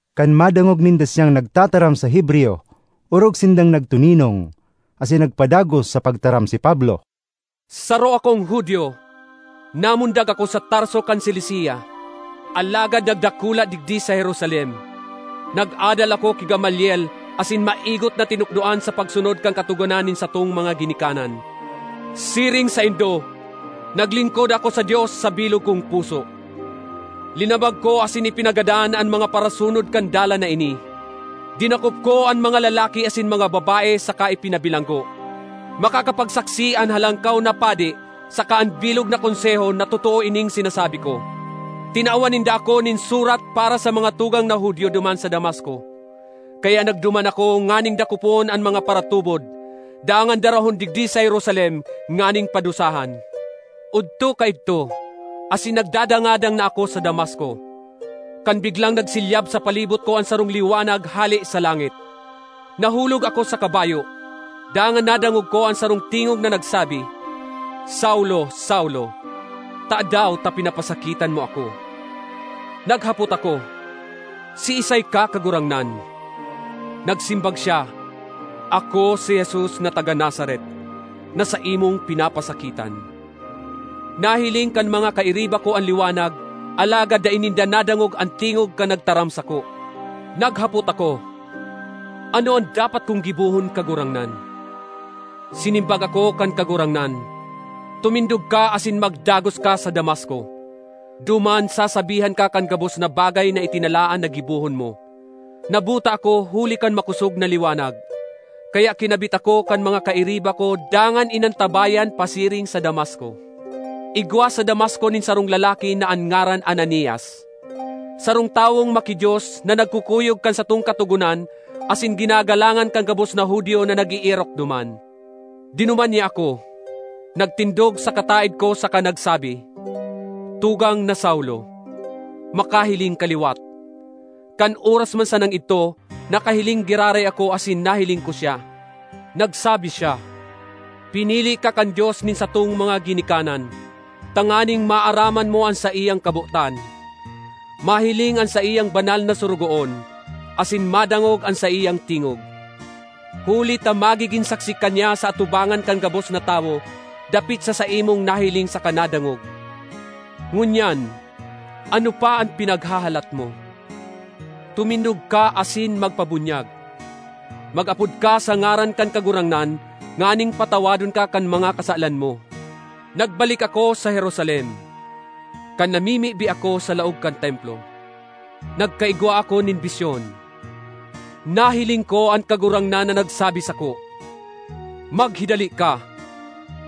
Kan madangog ninda siyang nagtataram sa Hebreyo, orog sindang nagtoninong. Asin nagpadagos sa pagtaram si Pablo: ”Saro akong Judio; namundag ako sa Tarso kan Cilicia, alagad nagdakula digdi sa Jerusalem. Nag-adal ako ki Gamaliel asin maigot na tinukdoan sa pagsunod kan Katogonan nin satong mga ginikanan. Siring saindo, naglingkod ako sa Dios sa bilog kong puso. Linamag ko asin ipinagadan an mga parasunod kan Dalan na ini. Dinakop ko an mga lalaki asin mga babae saka ipinabilanggo. Makakapagsaksi an Halangkaw na Padi saka an bilog na Konseho na totoo ining sinasabi ko. Tinawan ninda ako nin surat para sa mga tugang na Judio duman sa Damasco. Kaya nagduman ako nganing dakopon an mga paratubod dangan darahon digdi sa Jerusalem nganing padusahan. ”Odto kaidto asin nagdadangadang na ako sa Damasco, kan biglang nagsilyab sa palibot ko an sarong liwanag hale sa langit. Nahulog ako sa kabayo, dangan nadangog ko an sarong tingog na nagsabi, ‘Saulo, Saulo, tadaw ta pinapasakitan mo ako?’ Naghapot ako, ‘Siisay ka, Kagurangnan?’ Nagsimbag siya, ‘Ako si Jesus na taga Nazaret, na saimong pinapasakitan.’ Nahiling kan mga kairiba ko an liwanag alagad dai ninda nadangog an tingog kan nagtaram sako. Naghapot ako, ‘Ano an dapat kong gibohon, Kagurangnan?’ Sinimbag ako kan Kagurangnan, ‘Tumindog ka asin magdagos ka sa Damasco; duman sasabihan ka kan gabos na bagay na itinalaan na gibohon mo.’ Nabuta ako huli kan makosog na liwanag, kaya kinabit ako kan mga kairiba ko dangan inantabayan pasiring sa Damasco. ”Igwa sa Damasco nin sarong lalaki na an ngaran Ananias, sarong tawong maki-Dios na nagkukuyog kan satong Katogonan asin ginagalangan kan gabos na Judio na nag-eerok duman. Dinuman niya ako, nagtindog sa kataed ko saka nagsabi, ‘Tugang na Saulo, makahiling ka liwat!’ Kan oras man sanang idto nakahiling giraray ako asin nahiling ko siya. Nagsabi siya, ‘Pinili ka kan Dios nin satong mga ginikanan tanganing maaraman mo an saiyang kabotan, mahiling an saiyang banal na Sorogoon, asin madangog an saiyang tingog. Huli ta magigin saksi ka niya sa atubangan kan gabos na tawo dapit sa saimong nahiling saka nadangog. Ngunyan, ano pa an pinaghahalat mo? Tumindog ka asin magpabunyag. Mag-apod ka sa ngaran kan Kagurangnan nganing patawadon ka kan mga kasalan mo.’ ”Nagbalik ako sa Jerusalem; kan namimibi ako sa laog kan Templo, nagkaigwa ako nin bisyon. Nahiling ko an Kagurangnan na nagsabi sako, ‘Maghidali ka!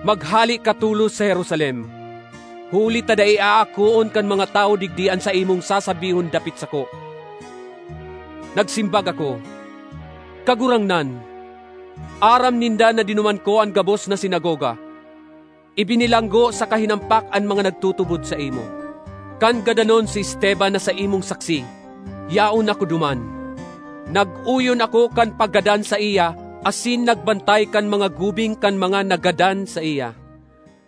Maghale ka tolos sa Jerusalem, huli ta dai aakoon kan mga tawo digdi an saimong sasabihon dapit sako.’ Nagsimbag ako, ‘Kagurangnan, aram ninda na dinuman ko an gabos na sinagoga, ibinilanggo saka hinampak an mga nagtutubod saimo. Kan gadanon si Esteban na saimong saksi, yaon ako duman. Nag-oyon ako kan paggadan saiya asin nagbantay kan mga gubing kan mga naggadan saiya.’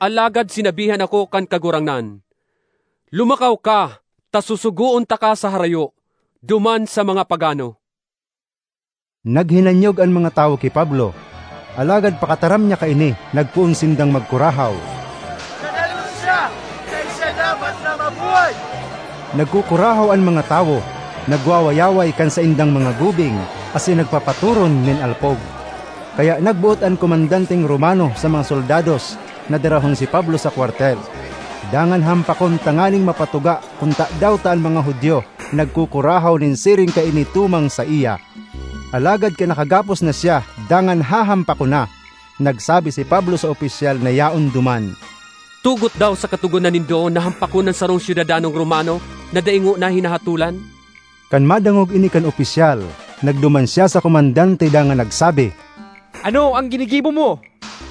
Alagad sinabihan ako kan Kagurangnan, ‘Lumakaw ka, ta susugoon taka sa harayo, duman sa mga pagano.’” Naghinanyog an mga tawo ki Pablo, alagad pakataram niya kaini nagpoon sindang magkurahaw, “Gadanon siya! Dai siya dapat na mabuhay!” Nagkukurahaw an mga tawo, nagwawayaway kan saindang mga gubing, asin nagpapaturon nin alpog. Kaya nagboot an komandanteng Romano sa mga soldados na darahon si Pablo sa kwartel, dangan hampakon tanganing mapatuga kun tadaw ta an mga Judio nagkukurahaw nin siring kaini tumang saiya. Alagad kan nakagapos na siya dangan hahampakon na, nagsabi si Pablo sa opisyal na yaon duman, “Tugot daw sa katogonan nindo na hampakon an sarong syudadanong Romano na dai ngona hinahatolan?” Kan madangog ini kan opisyal, nagduman siya sa komandante dangan nagsabi, “Ano an ginigibo mo?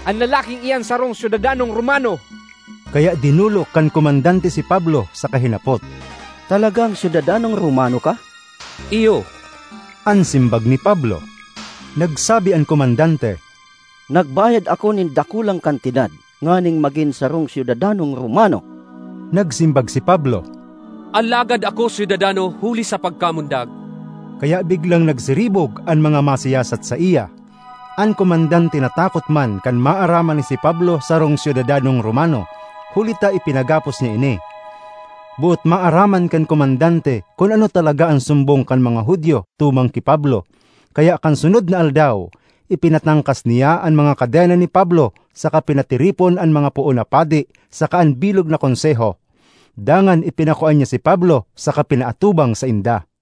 An lalaking iyan sarong syudadanong Romano!” Kaya dinolok kan komandante si Pablo saka hinapot, “Talagang syudadanong Romano ka?” “Iyo,” an simbag ni Pablo. Nagsabi an komandante, “Nagbayad ako nin dakulang kantidad nganing magin sarong syudadanong Romano.” Nagsimbag si Pablo, “Alagad ako syudadano huli sa pagkamundag.” Kaya biglang nagsiribog an mga masiyasat saiya; an komandante natakot man kan maaraman na si Pablo sarong syudadanong Romano, huli ta ipinagapos niya ini. Boot maaraman kan komandante kun ano talaga an sumbong kan mga Judio tumang ki Pablo, kaya kan sunod na aldaw, ipinatangkas niya an mga kadena ni Pablo saka pinatiripon an mga poon na padi saka an bilog na Konseho. Dangan ipinakua niya si Pablo saka pinaatubang sainda.